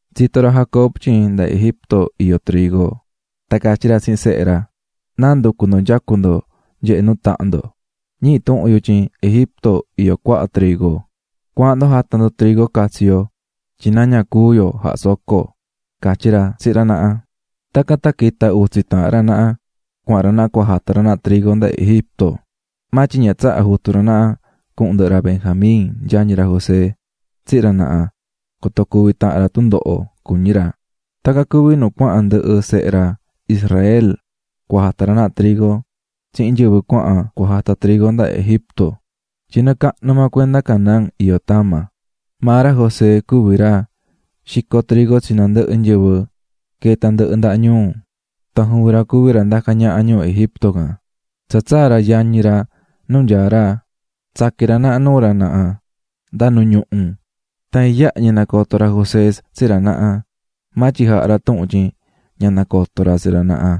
Tsito̱ ra Jacob tyin nda Egipto iyó trigo, tan catyí ra tsihin sehe ra: "¿Náa nducú ndo nyacú ndo nyehé nuu tahan ndo? Ñihí tuhun yu tyin Egipto iyó cuaha trigo. Cua̱ahan ndo jata ndo trigo catsi yo tyin na ña cúu yo jahá soco", catyí ra tsihin ra naha. Tacan tan quita̱ utsi taahan ra naha cuahan ra naha cua jata ra naha trigo nda Egipto. Maa tyin ña tsaha̱ jutu ra naha cuhun ndɨhɨ ra Benjamín, yañi ra José, tsihin ra naha, coto cuvi tahan ra tundoho, cuñí ra. Tacan cuví nu cuahan ndɨhɨ sehe ra Israel cua jata ra naha trigo tsihin nyɨvɨ cuahan cua jata trigo nda Egipto, tyin nɨɨ cahnu maa cuenda Canaán iyó tama. Maa ra José cuví ra xicó trigo tsi nandɨhɨ nyɨvɨ queé tandɨhɨ ndaha ñuu tan juvin ra cuví ra ndacá ñaha ñuu Egipto can. Tsa tsaa̱ ra yañi ra nu nyaá ra, tsaqui̱n ra naha nuu ra naha nda nu ñuhu. Tan iyaha ñi nacoto̱ ra José tsi ra naha, maa tyin jaha̱ ra tuhun tyin ña nacotó ra tsi ra naha,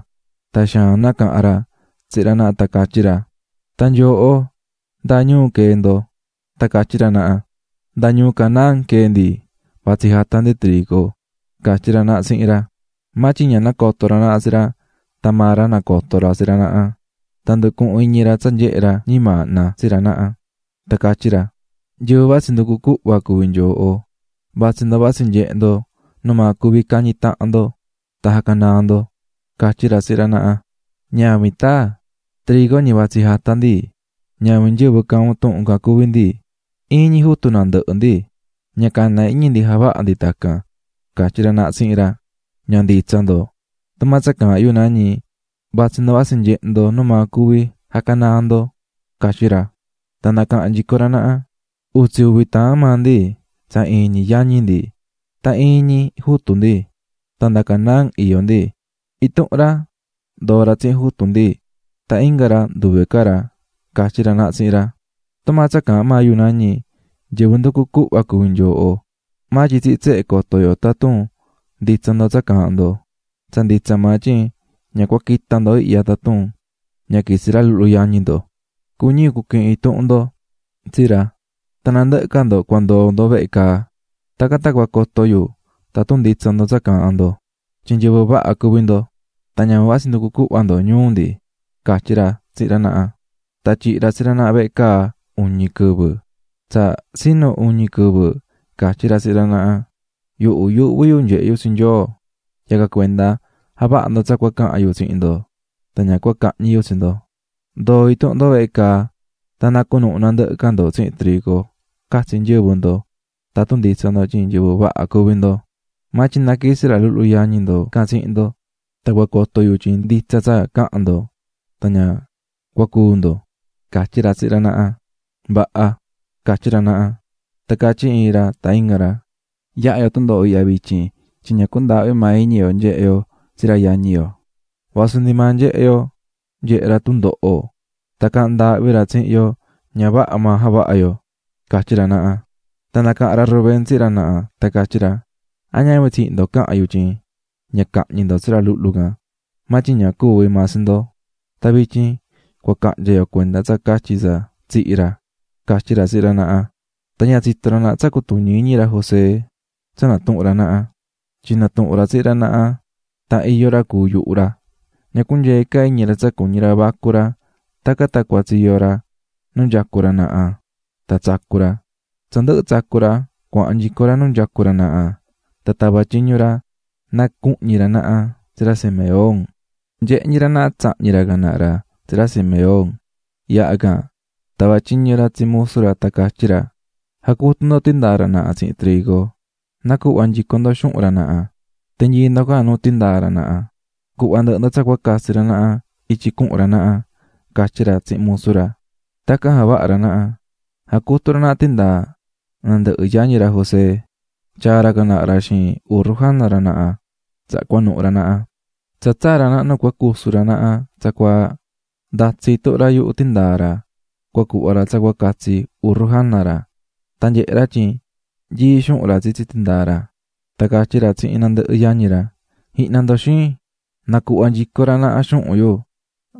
tan xaan nacaha̱n ra tsihin ra naha tan catyí ra: --¿Tan nyooho, ndáa ñuu quee̱ ndo? Tan catyí ra naha: --Nda ñuu Canaán quee̱ ndi, vatsí jata ndi trigo --catyí ra naha tsihin ra. Maa tyin ña nacoto̱ ra naha tsi ra, tan maa ra nacoto̱ ra tsi ra naha. Tan nducuhu̱n iñi ra tsa nyehe̱ ra ñimaahna tsi ra naha, tan catyí ra: --Nyɨvɨ vatsí nducu cuhva cuví nyooho, vatsí ndo vatsí nyehe ndo numaa cuvi cañi tahan ndo tan jacanaa ndo --catyí ra tsihin ra naha. --¡Ñavin, taa! Trigo ñi vatsí jata ndi. Ñavin nyɨvɨ caahán un tuhun can cuví ndi, iin ñi jutu nandɨhɨ ndi, ña cana iñi ndi javaha ndi tacan --catyí ra naha tsihin ra. --Ña nditsa ndo, tumaa tsa caahán yu nañi, vatsí ndo vatsí nyehe ndo numaa cuvi jacanaa ndo --catyí ra. Tan nacaha̱n nyico ra naha: --Utsi uvi taahan maa ndi tsa iin ñi yañi ndi, tan iin ñi jutu ndi tan nda Canaán iyó ndi. Intuhun ra ndoo̱ tsihin jutu ndi, tan inga ra nduve ca ra --catyí ra naha tsihin ra. --¡Tumaa tsa caahán maa yu nañi, nyɨvɨ nducú cuhva cuví nyooho. Maa tyin tsihin tsehe coto yo tatun nditsa ndo tsa caahán ndo. ¡Tsa nditsa maa tyin ña cua quita ndo ihya tatun ña quitsi ra luhlu yañi ndo! Cuñí yu cuquihin intuhun ndo tsi ra, tan nandɨhɨ ca ndo cua ndoo ndo vehe caa. Tacan tan cua coto yu tatun nditsa ndo tsa caahán ndo tyin nyɨvɨ vaha cuví ndo, tan ñavin vatsí nducú cuhva ndo ñuu ndi --catyí ra tsihin ra naha. Tan tyihi̱ ra tsi ra naha vehe caa uñi quɨvɨ. Tsa tsinu uñi quɨvɨ catyí ra tsihin ra naha: --Yuhu yuuhví yu nyehe yu tsi Nyoo, yacan cuenda, ja̱vaha ndo tsa cua cahan yu tsihin ndo, tan ña cua cahñi yu tsi ndo. Ndo̱o intuhun ndo vehe caa tan na cunuhu nandɨhɨ ca ndo tsihin trigo catsi nyɨvɨ ndo tatun nditsa ndo tyin nyɨvɨ vaha cuví ndo. Maa tyin na quitsi ra luhlu yañi ndo tsihin ndo tan cua coto yu tyin nditsa tsa caha̱n ndo tan ña cua cúu ndo --catyí ra tsihin ra naha. --Vaha --catyí ra naha. Tan catyí iin ra tan inga ra: --Yahá yo tundoho ihya vityin tyin ña cundaahvi̱ maa iñi yo nyehe̱ yo tsi ra yañi yo vasu ndi nyehe̱ yo nyehe̱ ra tundoho tan caahán ndaahvi ra tsihin yo, ña vaha maa javaha̱ yo --catyí ra naha. Tan nacaha̱n ra Rubén tsihin ra naha tan catyí ra: --¿A ñavin tsihin ndo caha̱n yu tyin ña jañicueehe ndo tsi ra luhlu can? maa tyin ña cuvi̱ maa tsi ndo, tan vityin cua cahnya yo cuenda tsa catyi tsa tsihi̱ ra --catyí ra tsihin ra naha. Tan ña tsitó ra naha tsa cutuñí iñi ra José tsa natuhún ra naha, tyin natuhu̱n ra tsihin ra naha tan iyó ra cuu̱ yuhu ra. Ña cunyeé ca iñi ra tsa cuñí ra vacu ra tacan tan cuatsiyo̱ ra nu nyacú ra naha tan tsacu̱ ra, tsa ndɨhɨ̱ tsacu̱ ra, cuahan nyico ra nu nyacú ra naha tan tava̱ tyiñu ra, na cuhñi ra naha tsi ra Simeón. Nyehé ñi ra naha tsahñi̱ ra can naha ra tsi ra Simeón. Yaha can, tava̱ tyiñu ra tsi musu ra tan catyí ra: --Ja̱cutu ndo tindaa ra naha tsihin trigo, na̱cuhva nyico ndo xuhun ra naha, ti̱nyii ndo can nu tindaa ra naha, cu̱hva ndɨhɨ ndo tsa cua catsi ra naha ityi cuhun ra naha --catyí ra tsihin musu ra. Tacan javaha̱ ra naha, jacutu̱ ra naha tindaa nandɨhɨ yañi ra José. Tyaa̱ ra can naha ra xiin urru jana ra naha, tsaha cuanuhu̱ ra naha. Tsa tsaa̱ ra naha nu cua cusu ra naha tsacuaa. Ndatsi̱ intuhun ra yuhu tindaa ra cua cuhva ra tsa catsi urru jana ra, tan nyehe̱ ra tyin nyií xuhun ra tsitsi tindaa ra. Tan catyí ra tsihin nandɨhɨ yañi ra: --Ji̱hna ndo, xin, nacuhva̱ nyico ra naha xuhun yu,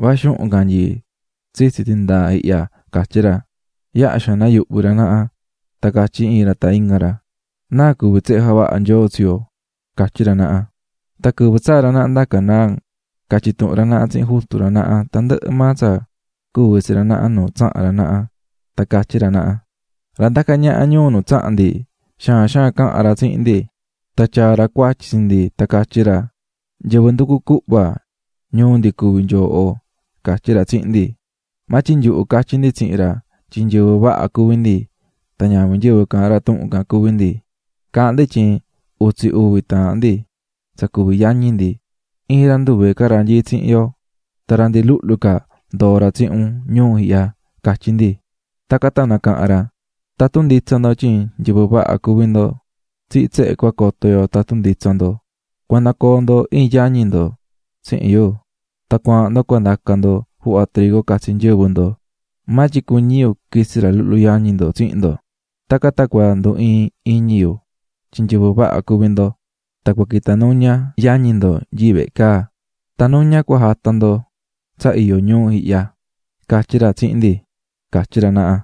va xuhun can nyií tsitsi tindaa ihya --catyí ra. Yaha xaan nayuhvi̱ ra naha tan catyí iin ra tan inga ra: --¿Náa cuví javaha̱ Nyoo tyehen tsihin yo? --catyí ra naha. Tan quɨvɨ tsaa̱ ra naha nda Canaán, catyi̱ tuhun ra naha tsihin jutu ra naha tandɨhɨ maa tsa cuvi̱ tsi ra naha nu tsaha̱n ra naha, tan catyí ra naha: --Ra ndacá ñaha ñuu nu tsaha̱n ndi xaan xaan caha̱n ra tsihin ndi, tan tyaa̱ ra cuatyi tsi ndi tan catyí ra: ꞌNyɨvɨ nducú cuhva ñuu ndi cuví nyoohoꞌ, catyí ra tsihin ndi. Maa tyin nyuhu catyí ndi tsihin ra tyin nyɨvɨ vaha cuví ndi tan ñavin nyɨvɨ caahán ra tuhun can cuví ndi. Caahán ndi tyin utsi uvi taahan ndi tsa cuví yañi ndi, iin ra nduve ca ra nyií tsihin yo, tan ra ndi luhlu ca ndoo̱ ra tsihin un ñuu ihya, catyí ndi. Tacan tan nacaha̱n ra: 'Tatun nditsa ndo tyin nyɨvɨ vaha cuví ndo, tsihin tsehe cua coto yu tatun nditsa ndo. Cua nacoo ndo iin yañi ndo tsihin yu, tan cua̱ahan ndo cua ndaca ndo juhva trigo catsi nyɨvɨ ndo, maa tyin, cuñí yu quitsi ra luhlu yañi ndo tsihin ndo. Tacan tan cua ndu iin iñi yu tyin nyɨvɨ vaha cuví ndo, tan cua quita nuña yañi ndo nyií vehe caa, tan nuña cua jata ndo tsa iyó ñuu ihyaꞌ, catyí ra tsihin ndi ―catyí ra naha.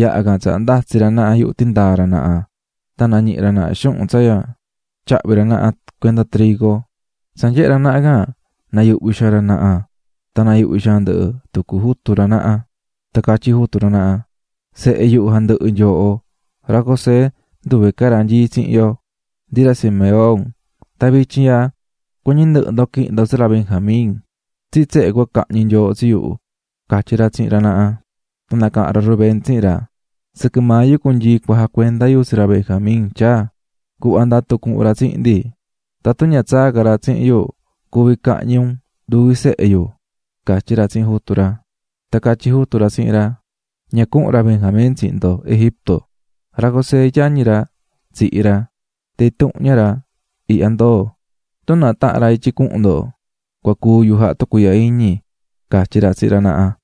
Yaha can tsaha ndatsi̱ ra naha yuhu tindaa ra naha tan nañihi̱ ra naha xuhun tsa tyahvi̱ ra naha cuenda trigo, tsa nyehe̱ ra naha can nayuhvi̱ xaan ra naha tan nayuhvi̱ xaan ndɨhɨ tucu jutu ra naha. Tan catyí jutu ra naha: --Sehe yuhu jandɨhɨ nyooho, ra José nduve ca ra nyií tsihin yo, ndi ra Simeón, tan vityin ihya cuñí ndɨhɨ ndo quihin ndo tsi ra Benjamín. Tsihin tsehe cua cahñi nyooho tsi yu --catyí ra tsihin ra naha. Tan nacaha̱n ra Rubén tsihin ra: --Sɨquɨ maa yu cunyii cua jacuenda yu tsi ra Benjamín tyaa, cu̱hva ndatu cuhun ra tsihin ndi, tatun ña tsaa ca ra tsihin yu cuví cahñi un nduvi sehe yu --catyí ra tsihin jutu ra. Tan catyí jutu ra tsihin ra: --Ña cuhun ra Benjamín tsihin ndo Egipto. Ra José, yañi ra, tsihi̱ ra, tan intuhun ña ra ihya ndoo̱. Tun náa tahan ra ityi cuhun ndo, cua cúu yu jaha tucuiihya iñi --catyí ra tsihin ra naha.